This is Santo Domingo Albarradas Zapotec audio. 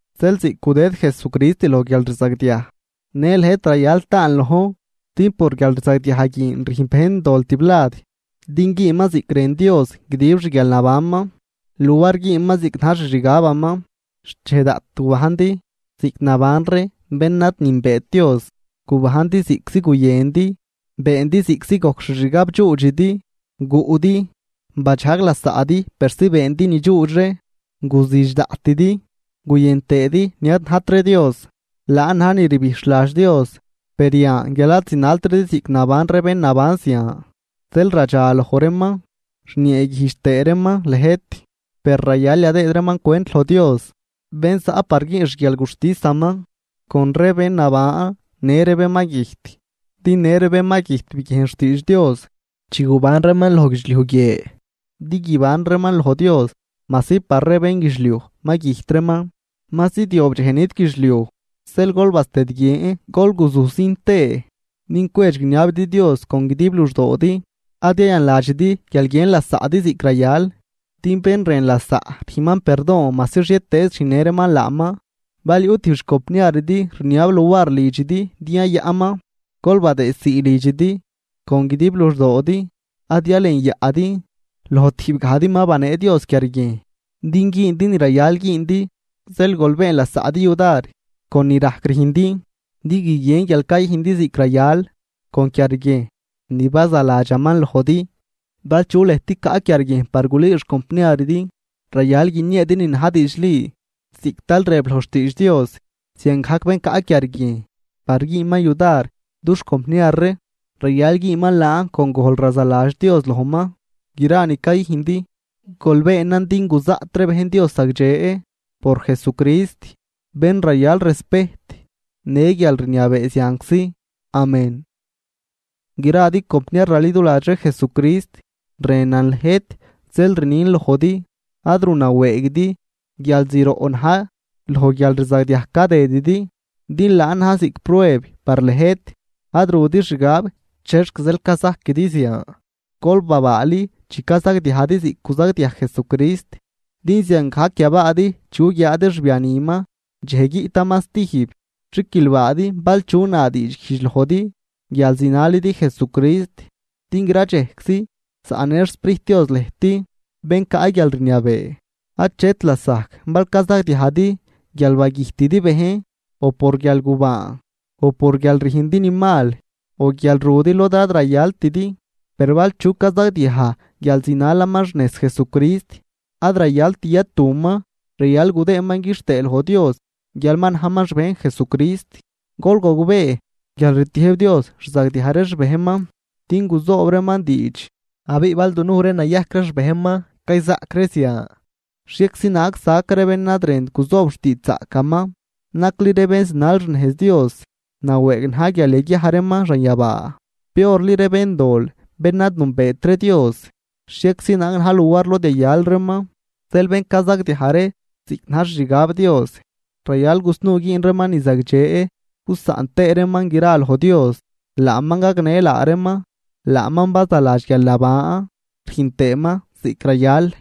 Zeel ziꞌc gudëd Jesucrist loj guialrzagdiaj, në lëjt rayal taan lojn. Din por guialrzagdiaj guin rüjn bejn dol tiblad, din güünman ziꞌc rën Dios guidib xguialnabanman luar güünman ziꞌc na̱j xixgabaman. Xchej daꞌt gubajndi ziꞌc naban ree bén ad nünbeet Dios, gubajndi ziꞌctzi guyëndi, beendi ziꞌctzi gojc xixgab dxuudxidi, guꞌdi, badxajg lasaꞌdi persi beendi nidxuux ree, guzüdx daꞌtidi, guyën tëëdi ni ad najt ree Dios, laan na̱j ni rbijxhladx Dios. Per yan guial ad zinaltridi ziꞌc naban ree bén naban zian, zeel radxa loj reeman, rnieeguijdx tëë reeman lëjt. Per rayal yadëëd reeman cwent loj Dios bén zaꞌ par güün xguialguxtisaman con ree bén naban në ree bén ma güjt. Din në ree bén ma güjt biguiejn xtiidx Dios chi guban reeman loj guidxliuj guie, din guiban reeman loj Dios majsi par ree bénguidxliuj ma güjt reeman. Ma zidyob dxej nit guidxliuj, zeel gol bastëdguien gol guzujsin tëë din cwedx guiniabidi Dios con guidib luxdoodi. Ad yayanladxidi guial guiën lasaꞌdi ziꞌc rayal, din bén rën lasaꞌ rüjnman perdon majsi xhietëëz rüjnnë reeman laaman. Bal yuꞌ tijb xcompniaridi rniab luar lidxidi din yayaꞌnman, gol badëëdsii lidxidi con guidib luxdoodi ad yalenyaꞌdi. Loj tijb gajdi ma banee Dios quiarguiejn din güündi ni rayal güündi. Zeel gol been lasaꞌdi yudar con ni rajc rüjndi, din guiguien guial cayüjndi ziꞌc rayal con quiarguiejn ni bazaladxaman lojdi. Bal chu lëjt caꞌ quiarguiejn par gulüü xcompniaridi, rayal guinieedi ni na̱j diidxli ziꞌc tal rëb loj xtiidx Dios, ziangajc bén caꞌ quiarguiejn par güünman yudar dux compniar ree, rayal güünman laan con gojl razaladx Dios lojman. Gra ni cayüjndi, gol beenan din guzaꞌt ree bejn Dios zagdxe por Jesucrist, bén rayal respejt në guialrniabee zianczi. Amén. Gradi compniar raliduladx ree Jesucrist, rënan lëjt, zeel rnin lojdi, ad ru nawëëguidi guial zroꞌ na̱j loj guialrzagdiaj cadëdidi, din laan na̱j ziꞌc prueb par lëjt. Ad rudi xgab chexc zeel cazajquidi zian. Gol babaali chi cazagdiajdi ziꞌc guzagdiaj Jesucrist, din ziangajc yabaadi chi guguiaadi xbianiman dxej guiꞌtaman stijb. Xiquilbaadi bal chu na diidxguijdx lojdi guial zinalidi Jesucrist, din gra dxejczi zaꞌnë xSprijt Dios lëjt, bén caꞌ guialrniabee. Achet lasajc bal cazagdiajdi guial bagüjtidi bejn, o por guialgubaan, o por guial rüjndi ni mal o guial rudi lod ad rayaltidi. Per bal chu cazagdiaj guial zinalaman xnejz Jesucrist, ad rayalt yatuman, rayal gudëëman quixtëë loj Dios guial ma najman xbejn Jesucrist. Gol gogbee, guial rtiëjb Dios rzagdiaj ree xbejnman din guzoob reeman diidx, abiꞌ bal dunuj ree nayajc ree xbejnman cayzaꞌc ree zian, xhieczi naag sac ree bén ad rënt guzoob xtiidxzaꞌcaman. Nacli ree bén zinal xnejz Dios nawëëg na̱j guial yaguiaj reeman xanyabaa, piorli ree béndol bén ad nünbeet ree Dios, xhieczi naag na̱j luar lod yayal reeman. Zeel bén cazagdiaj ree ziꞌc na̱j xixgab Dios, rayal gusnuu güün reeman ni zagdxe gusaꞌn tëë reeman gran loj Dios, laaman gagnë laa reeman. Laaman bazaladx guialnaban rüjn tëëman ziꞌc rayal.